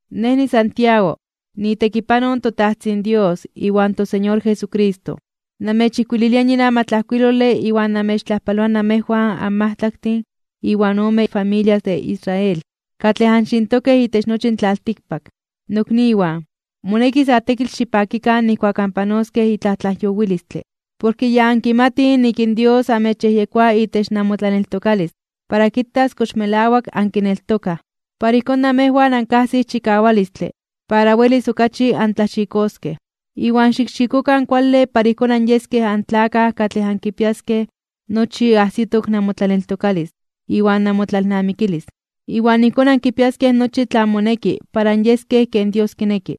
Nej niSantiago, niitekipanoj in toTajtzin Dios iwan toSeñor Jesucristo. Namechijkuililia yin amatlajkuilole iwan namechtlajpaloa namejwan anmajtlaktin iwan ome familias de Israel, katlej anxintokej itech nochi in tlaltikpak. Nokniwan, moneki sa tekitl xipakikan nijkuak anpanoskej itlaj tlajyowilistle. Porke ya ankimatij nik in Dios amechyejyekoa itech namotlaneltokalis para kitas kox melawak ankineltokaj. Para ijkón namejwan ankajsij chikawalistle para welis okachi antlaxikoskej. Iwan xikxikokan kuale para ijkón anyeskej antlakaj katlej ankipiaskej nochi ajsitok namotlaneltokalis iwan namotlalnamikilis, iwan ijkón ankipiaskej nochi tlan moneki para anyeskej ken Dios kineki.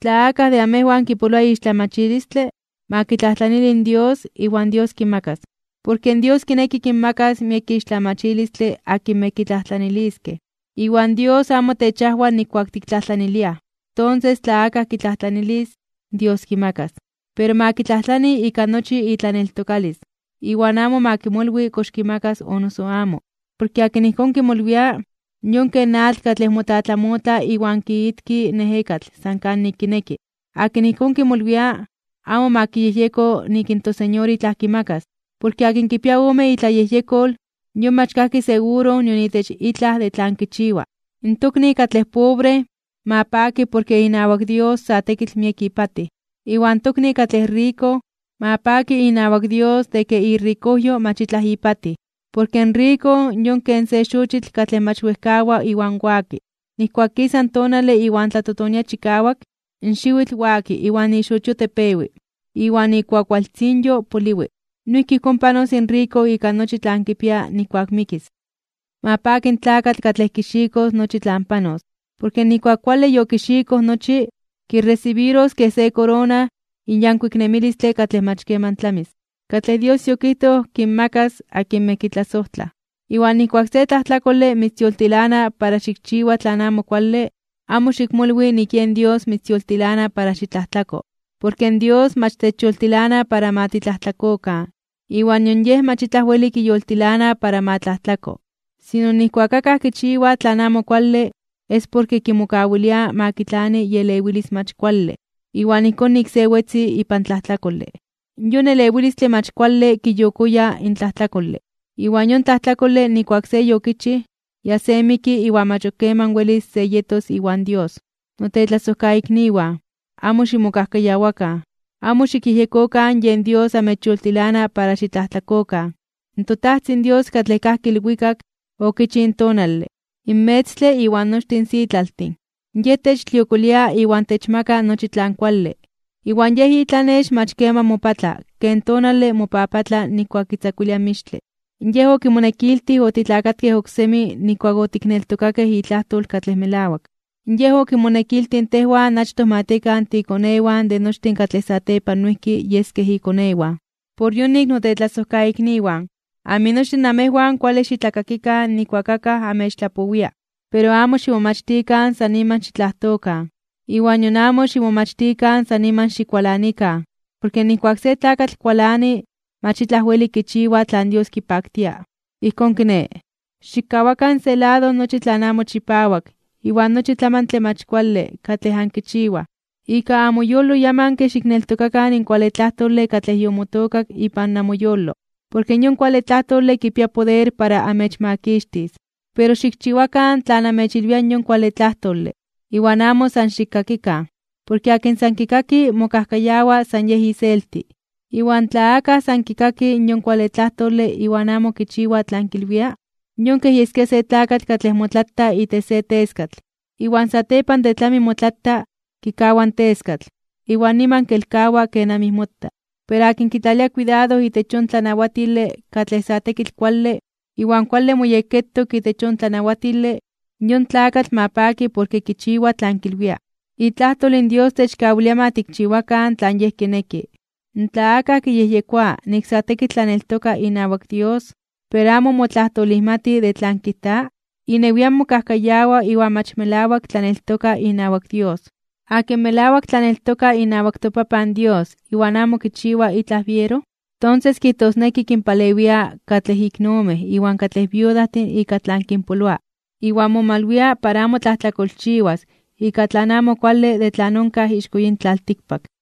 Tla akaj de amejwan kipoloa ixtlamachilistle, ma kitlajtlanili in Dios, iwan Dios kimakas. Porke Dios kineki kinmakas miek ixtlamachilistle akinmej kitlajtlaniliskej, iwan Dios amo techajwa nijkuak tiktlajtlaniliaj. Tonses tla akaj kitlajtlanilis, Dios kimakas. Pero ma kitlajtlani ika nochi itlaneltokalis, iwan amo ma kimolwi kox kimakas o noso amo. Porke akin ijkón kimolwia, yon ken atl katlej motlatlamotla iwan kiitki in ejekatl san kanik kineki. Akin ijkón kimolwia, amo ma kiyejyeko nik in toSeñor itlaj kimakas. Porke akin kipia ome itlayejyekol, yon mach kajki seguro nion itech itlaj de tlan kichiwa. In tokni katlej pobre, ma paki porke inawak Dios sa tekitl miek ipatij. Iwan tokni katlej riko, ma paki inawak Dios de ke irikojyo mach itlaj ipatij. Porke in riko yon ken se xochitl katlej mach wejkawa iwan waki. Nijkuak kisa in tonale iwan tlatotonia chikawak, in xiwitl waki iwan ixochio tepewi, iwan ikuakualtzinyo poliwi. Noijki ijkón panos in riko ika nochi tlan kipia nijkuak mikis. Ma paki in tlakatl katlej kixikos nochi tlan panos, porke nijkuak kuale yokixikoj nochi, kiresibiros kej se korona in yankuik nemilistle katlej mach keman tlamis, katlej Dios yokijtoj kinmakas akinmej kitlasojtlaj. Iwan nijkuak se tlajtlakole mitzyoltilana para xikchiwa tlan amo kuale, amo xikmolwi nik yen Dios mitzyoltilana para xitlajtlako. Porke in Dios mach techyoltilana para ma titlajtlakokan iwan nion Yej mach itlaj weli kiyoltilana para ma tlajtlako. Sino, nijkuak akaj kichiwa tlan amo kuale es porke kimokawilia ma kitlani ielewilis mach kuale. Iwan ijkón nik se wetzi ipan tlajtlakole. Yon elewilistle mach kuale kiyokoya (kiyolitia) in tlajtlakole. Iwan yon tlajtlakole nijkuak se yokichij, ya se miki iwan mach ok keman welis se yetos iwan Dios. Notetlasojkaikniwan, amo ximokajkayawakan. Amo xikyejyekokan yen Dios amechyoltilana para xitlajtlakokan. ToTajtzin Dios katlej kajki ilwikak, okichij in tonale, in metztle iwan nochtin in sitlaltin. Yej techtliokolia iwan techmaka nochi tlan kuale. Iwan Yej itlanex mach keman mopatla ken tonale mopapatla nijkuak kitzakuilia in mixtle. Yej, okimonekiltij, otitlakatkej oksemi nijkuak otikneltokakej itlajtol katlej melawak. Yej okimonekiltij tejwan achtoj ma tiekan tiikonewan de nochtin katlej satepan noijki yeskej ikonewan. Por yonik, notetlasojkaikniwan, aminochtin namejwan kuale xitlakakikan nijkuak akaj amechtlapowia. Pero amo ximomachtikan san niman xitlajtokan, iwan nion amo ximomachtikan san niman xikualanikan. Porke nijkuak se tlakatl kualani, mach itlaj weli kichiwa tlan Dios kipaktia. Ijkón kiné, xikkawakan se lado nochi tlan amo chipawak iwan nochi tlamantle mach kuale katlej ankichiwaj. Ika amoyolo yamanke xikneltokakan in kuale tlajtole katlej yomotookak ipan namoyolo, porke yon kuale tlajtole kipia poder para amechmakixtis. Pero xikchiwakan tlan amechilwia in yon kuale tlajtole, iwan amo san xikkakikan. Porke akin san kikaki mokajkayawa san yej iselti. Iwan tla akaj san kikaki in yon kuale tlajtole iwan amo kichiwa tlan kilwia, yon kej yeskia se tlakatl katlej motlata itech se teskatl. Iwan satepan de tlami motlata, kikawa in teskatl, iwan niman kelkawa kenamij mota. Pero akin kitlalia kuidado itech yon tlanawatile katlej sa tekitl kuale, iwan kuale moyekketok itech yon tlanawatile, in yon tlakatl ma paki porke kichiwa tlan kilwia. Itlajtol in Dios techkawilia ma tikchiwakan tlan Yej kineki. Tla akaj kiyejyekoa nik sa tekitl tlaneltoka inawak Dios, pero amo motlajtolijmati de tlan kijta, inewian mokajkayawa iwan mach melawak tlaneltoka inawak Dios. Akin melawak tlaneltoka inawak toPapan Dios iwan amo kichiwa itlaj biero, tonses kijtosneki kinpalewia katlej iknomej iwan katlej viudajtin ika tlan kinpoloa, iwan momalwia para amo tlajtlakolchiwas ika tlan amo kuale de tlan onkaj ixko yin tlaltikpak.